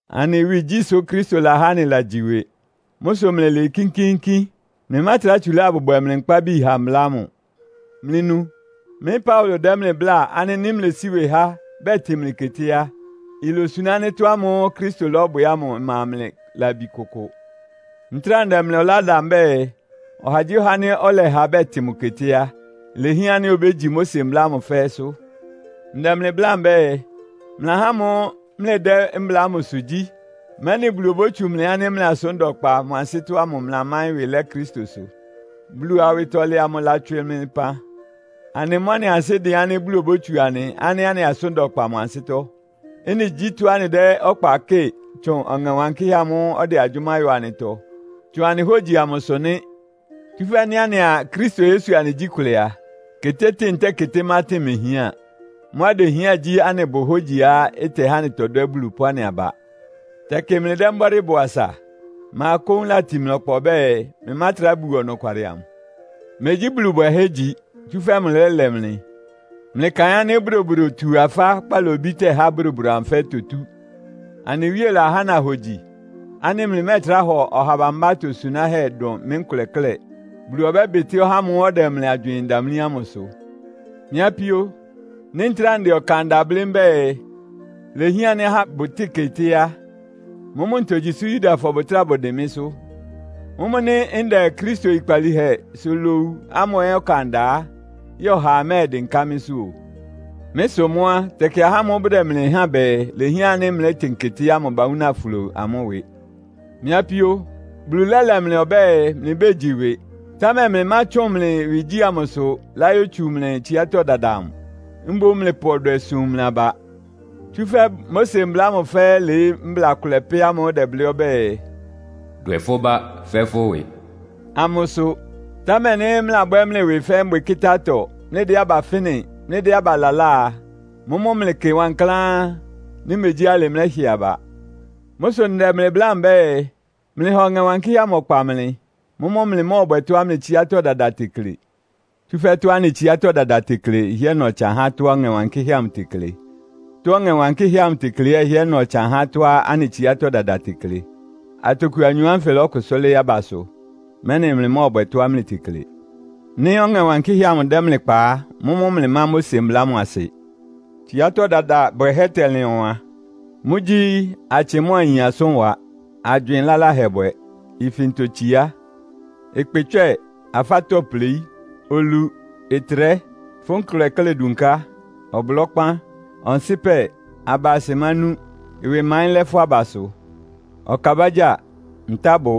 Anɩ ɩwɩgyí sʋ Kristo lahá anɩlagyi ɩwɩ! Mʋ́ sʋ mlɩlɩɩ kínkíínkín. Mlɩmátrá tsulá abʋbwɛ mlɩ nkpábi ha mbla ámʋ. Mlɩnu! Mɩ́ Paulo dɛ́ mlɩ bláa ánɩ́ nɩ́ mlesí ɩwɩ há, bɛtɩn mlɩ keté a, ilosuná ánɩ́ tɔ́ ámʋ́ʋ́ Kristo lɔ́bwɛ ámʋ ɩma mlɩ labi kʋkʋ. Ntráa ndɛ mlɩ ɔlá da mbɛ́ɛ, ɔhagyíɔha ánɩ́ ɔlɛha bɛtɩn mʋ keté á, ilehián ánɩ́ obégyi Mose mbla ámʋ fɛ́ɛ́sʋ́. Ndɛ mlɩ bláa mbɛ́ɛ, mlɩ ahá ámʋ́ʋ́ mlɩdɛ́ mbla ámʋsʋ gyí, mɛ́nɩ Bulu obótsu mlɩ ánɩ́ mlɩ asʋ́n da ɔkpa mʋ ansɩ́tɔ́ ámʋ mlɩlamáɩ́n ɩwɩ lɛ́ Kristosʋ. Bulu awɩtɔlɛ amʋ ɩlatswɩ mlɩ pan. Anɩ mʋ́ anɩ ansɩ́ dɩn ánɩ́ Bulu obótsu anɩ ánɩ́ anɩ asʋ́n da ɔkpa mʋ ansɩ́tɔ́. Ɩ́nɩ gyí tɔ́á anɩdɛ́ ɔkpa kɩ́ɩ tsʋn Ɔŋɛ Wankɩ́hɛ́ amʋ́ʋ́ ɔdɛ agyʋ́má yɔ anɩtɔ, tsʋn anɩ hógyisʋ ámʋsʋ nɩ́. Tsúfɛ́ nɩ́ anɩa Kristo Yesu anɩgyí kʋlɛ a, ketétɩ́ɩn ntɛ́ɛ ketémátɩn mehián. Mʋ́á idehián gyí anɩbʋ hógyiá ɩtɛhá anɩtɔdwɛ́ Bulu pʋ́ anɩ aba. Tɛkɩ mlɩdɛ́ mbɔ́dɩ́ bɔ asa. Ma kóún latin mlɩ ɔkpa ɔbɛ́ɛ, mlɩmátrá buo ɔnɔkwalɩ amʋ? Megyí Bulu bwɛhɛ́ igyi, tsúfɛ́ mʋlɛ́lɛ mlɩ. Mlɩkaɩn ánɩ́ bodobodotu-afá kpalobí tɛ́há bodobodo amʋ fɛ́ɛ́ itotú. Anɩ Wíe lahá nahogyi, ánɩ́ mlɩmɛ́ɛtrá hɔ ɔha bambá atosunáhɛ́ dʋn mɩ́ nkʋlɛ klɛ́. Bulu ɔbɛ́bɩtɩ́ ɔhá ámʋ́ʋ́ ɔdɛ mlɩ agywɩɩn damlí ámʋ ɩsʋ. Mɩ́ apíó, nɩ́ ntráa ndɛ ɔkan da blɩ́ mbɛ́ɛ, ilehián ánɩ́ ahá bʋtɩ́ɩn keté á, mʋ́mʋ́ ntogyi sʋ́ Yudafɔ bʋtráa bʋdɩn mɩ́sʋ́? Mʋ́mʋ́ nɩ́ ndɛ Kristo oyikpalíhɛsʋ lowu ámʋ ɛ́ ɔkan da á, yɛ́ɛ ɔhaa mɛ́ɛdɩnká mɩ́sʋ́ o. Mɩ́ sʋ mʋ́ á, tɛkɩ ahá ámʋ́ʋ́ bʋdɛ mlɩ háan bɛɛ, ilehián ánɩ́ mlɛ́tɩn keté ámʋ bawúna flo amʋ́ ɩwɩ. Mɩ́ apíó, Bulu lɛ́lɛ mlɩ ɔbɛ́ɛ, mlɩbégyi ɩwɩ. Támɛ mlɩmátsʋn mlɩ ɩwɩgyí amʋsʋ láyótsu mlɩ tsiátɔ́ dada amʋ. Mboún mlɩpʋ ɔdwɛ sum mlɩ aba, tsúfɛ́ Mose mbla ámʋ fɛ́ɛ́ ɩlɩɩ́ mbla kʋlɛ pɛ́ ámʋ́ʋ́ ɩdɛblɩ́ ɔbɛ́ɛ, “Dwɛ fʋ́ bá fɛ́ fʋ́ ɩwɩ.” ámʋsʋ. Támɛ nɩ́ mlɩlabwɛ́ mlɩ ɩwɩ fɛ́ mbwɩkɩ́tá-atɔ, mlɩdɛ́ aba fɩ́nɩ, mlɩdɛ́ aba lalá a, mʋ́mʋ́ mlɩkɩ wankláán; nɩ́ megyí alɩ mlɛ́hɩ aba. Mʋ́ sʋ ndɛ mlɩ bláa mbɛ́ɛ, mlɩha Ɔŋɛ Wankɩ́hɛ́ amʋ ɔkpa mlɩ. Mʋ́mʋ́ mlɩmɔ́ɔbwɛ tɔ́á mlɩ tsiátɔ́ dada tekle. Tsúfɛ́ tɔ́á anɩ tsiátɔ́ dada tekle ɩhɩ́ɛ́ na ɔtsan há tɔ́á Ɔŋɛ Wankɩ́hɛ́ amʋ tekle. Tɔ́á Ɔŋɛ Wankɩ́hɛ́ amʋ tekle ɛ́ ɩhɩ́ɛ́ na ɔtsan há tɔ́á anɩ tsiátɔ́ dada tekle. Atoku anyɔ ánfɩ ɩlɔkʋsʋ́ lɩ́ɩ́ abasʋ, mɛ́nɩ mlɩmɔ́ɔbwɛ tɔ́á mlɩtekle. Nɩ́ Ɔŋɛ Wankɩ́hɛ́ amʋ dɛ́ mlɩ kpa á, mʋ́mʋ́ mlɩmá Mose mbla ámʋ asɩ. Tsiátɔ́ dada bwɛhɛ́ tɛlɩn ɔwan. Mʋ́gyí; atsɩ mʋ́a ayin asʋ́nwa, agywɩɩn laláhɛ bwɛ, ifintotsiá, ɩkpɩtswɛ́ɛ, afátɔ́pleí, olu, ɩtrɛ́, fʋ́ nkʋlɛ klɛ́ dunká, ɔblɔ́kpán, ɔnsɩpɛ, aba asɩmánú, ɩwɩmaɩ́n lɛ́ fʋ́ abasʋ, ɔkabágyáa, ntábʋ,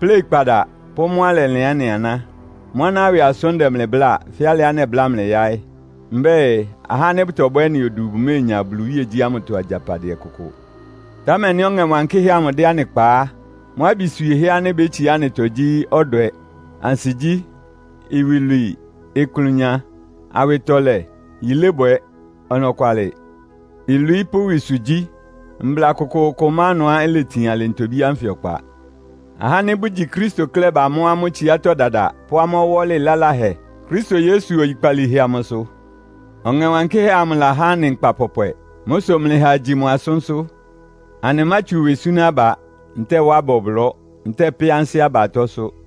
pléikpada pʋ́ mʋ́á ɩlɛlɩan ɩ́nɩ aná. Mʋ́ aná ɩwɩ asʋ́n ndɛ mlɩ bláa, fɛ́ alɩá nɛbláa mlɩ yaɩ́. Mbɛ́ɛ, ahá ánɩ́ bʋtɔbwɛ́ ɩ́nɩ odu bʋméenya Bulu iwíegyí ámʋtɔ agyapadɩɛ kʋkʋ. Támɛ nɩ́ Ɔŋɛ Wankɩ́hɛ́ amʋ dɛ́ anɩ kpa á, mʋ́ abi swiehɛ́ ánɩ́ ibétsiá anɩtɔ gyí, ɔdwɛ, ansigyí, iwilwii, ɩklʋnya, awɩtɔlɛ, yilébwɛ, ɔnɔkwalɩ, ilwií pʋ́ ɩwɩsʋgyí. Mbla kʋkʋʋkʋ má ɩnʋá iletin alɩ ntobí ánfɩ ɔkpa. Ahá ánɩ́ bʋgyi Kristo klɛ́ bamɔ́ amʋ́ tsiátɔ́ dada pʋ́ amʋ́ ɔwɔ́lɩ laláhɛ Kristo Yesu oyikpalíhɛ amʋsʋ. Ɔŋɛ Wankɩ́hɛ́ amʋ lahá anɩ nkpa pɔpwɛ. Mʋ́ sʋ mlɩha agyi mʋ asʋ́nsʋ́. Anɩmátsu ɩwɩ súná aba, ntɛ́ɛ wá aba ɔblɔ́, ntɛ́ɛ pɛ́ ansɩ́ aba atɔ́sʋ́.